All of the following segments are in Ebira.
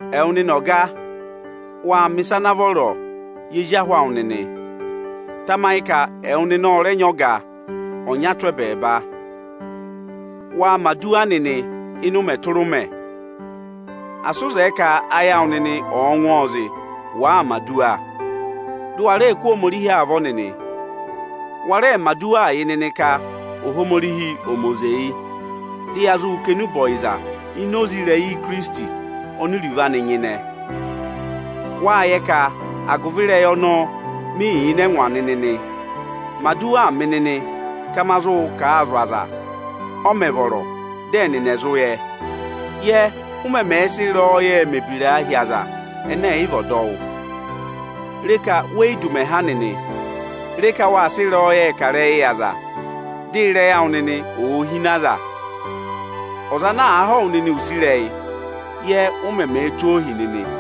Ẹwụ nịnị ọga, waa mẹ̀ ịsa ana vọrọọ yị ezi ahụ awụ nịnị. Tamayị ka ẹwụ nịnị ọ rẹ nyị ọga ọnya tụ́ ẹbẹẹba. Waa mẹ̀ aduwa nịnị ịnị ụmẹ tụra ụmẹ; asị ụ zẹẹ ka ayị awụ nịnị ọ̀ọ ngụ ọọ zị, wàa mẹ̀ aduwa; dị ụ wa rẹẹ kụ́ Ohomorihi avọ nịnị Wa rẹẹ mẹ̀ aduwaa yị nịnị ka Ohomorihi ọ̀ mẹ oze yị, dị ya zụ kà enube ọyịza ini oze ịrẹyị Ikirisiti oni iruvo anị nyịnẹ. Waa yẹ ka agụvị ịrẹyị ọnọọ mị yà ịnị ẹngwa nịnị nị. Mẹ aduwaa mị nịnị ka ma zụ kà a zụ̀ aza, ọ mẹ̀ vọrọ, dị ẹnịnị ẹ̀ zụ yẹ. Yẹ, ụ mẹmẹẹ sị ịrẹyọyẹẹ mẹ ebiraa hi aza ẹnẹ ẹ̀ yị vị ọdọwụ. Re ka we yi du ụmẹ ha nịnị. Re ka waa sị ịrẹyọyẹẹ kà ịrẹyịị yị aza, dị ịrẹyị awụ nịnị òo hine aza. Ọza ana àa họ̀ wụ nịnị use ịrẹyị, yẹ ụ mẹmẹẹ tụ́ ọọ ohi nịnị.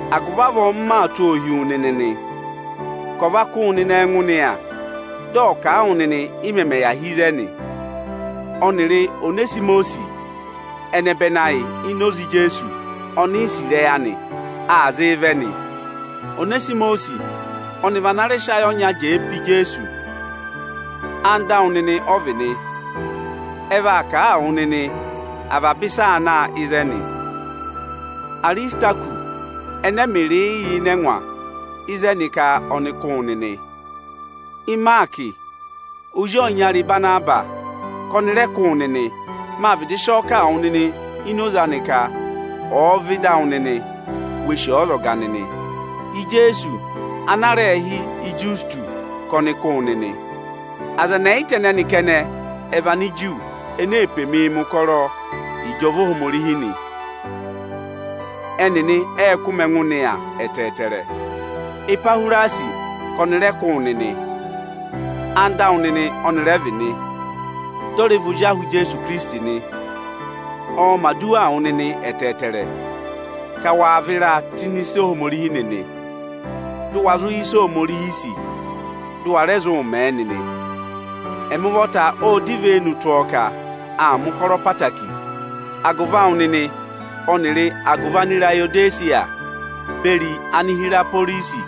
Agụvị avọọ m maa tụ́ ọ hi wu nịnị nị, ka ọ̀ va kụ́ wụ nịnị ẹngụ nịya, dị ọ̀ kà a wụ nịnị, ị mẹmẹ yà hi ịzẹnị. Ọnịrị Onesimọsị ẹnẹbẹnị ayị ini oze Ijeesu oni i sì ịrẹyị anị, aa zịị vẹ nị. Onesimọsịị ọnị vị ana rẹ sị ayị ọnya jẹẹ pe Ijeesu. Anda awụ nịnị ọ vị nị. Ẹ vaa kà a wụ nịnị avaba ịsị aa na ịzẹnị. Arisitakọsị ẹnẹ ẹmịrịị yà ịnị ẹngwa ịzẹnị ka ọnị kụ́ wụ nịnị. Ịmaakị, ozi ọyịnyara Ịbanabasị, ka ọnị rẹ kụ́ wụ nịnị. Màa vịdị sị ọ kà a wụ nịnị ini oze anị ka ọ̀ọ vẹ ịda awụ nịnị, we sì ọọ ọzọga nịnị. Ijeesu ana aā rẹẹ hị́ Ịjọsịtọsị ka ọnị kụ́ wụ nịnị. Aza ẹnị ẹyịta ẹnẹnị kẹnẹ ẹ vị Aniju ene ee pe mii mẹ̀ ụkọrọ yị ịjọva Ohomorihi nị. Ẹnịnị ệ kụ́ mị ẹngụ nịya ẹtẹẹtẹrẹ. Epahwirasi ka ọnị rẹ kụ́ wụ nịnị. Anda awụ nịnị ọnị rẹ vị, dị ọ rẹ vị ozi ahụ Ijeesu Ikirisiti nị. Ọọ̄ mẹ̀ aduwaa wụ nịnị ẹtẹẹtẹrẹ, ka waa vịraa tụ́ ịnị ịsa Ohomorihi nịnị; dụ wa zụ yẹ ịsị Ohomorihi sì, dị ụ wa rẹ zụụ mẹẹ nịnị. Ẹmị ụvọta ọ́ọ dọ ivenu tụ́ ọọ ka aa mẹ̀ ụkọrọ ẹtẹẹtẹrẹ agụvị awụ nịnị ọnịrị agụvị Anirayodesiya beri Anihiraporisi.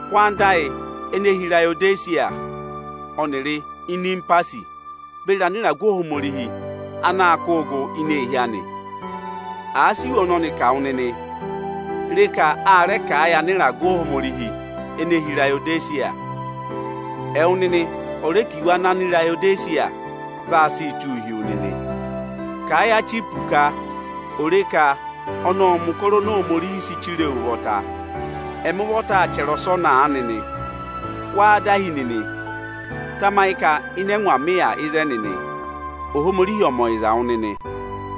Kụ́ anda ayị ene hi Irayodesiya, ọnịrị Inimpasi beri anịragụ Ohomorihi anaā kụ́ụ gụ ini eehi anị! Àa sị iwe ọnọnị kà wụ nịnị, re ka a rẹ kà a yị anịragụ Ohomorihi ene hi Irayodesiya. Ẹwụ nịnị ọ̀ rẹ kà iwe anị Anirayodesiya vaa sịị tụ́ụ hi wu nịnị! Kà ẹ yị Achipọsị ka ò re ka ọnị ọ́ọ mẹ̀ ụkọrọ oni Ananyị yị sị chire e ụvọ. Ẹmị ụvọta aa chẹrẹ ọsọnị aanị nị: Wáá dahi nịnị? Tamayị ka ịnị ẹngwa mị yà ịzẹnị nị. Ohomorihi ọ̀ mẹ ọyịza wụ nịnị o.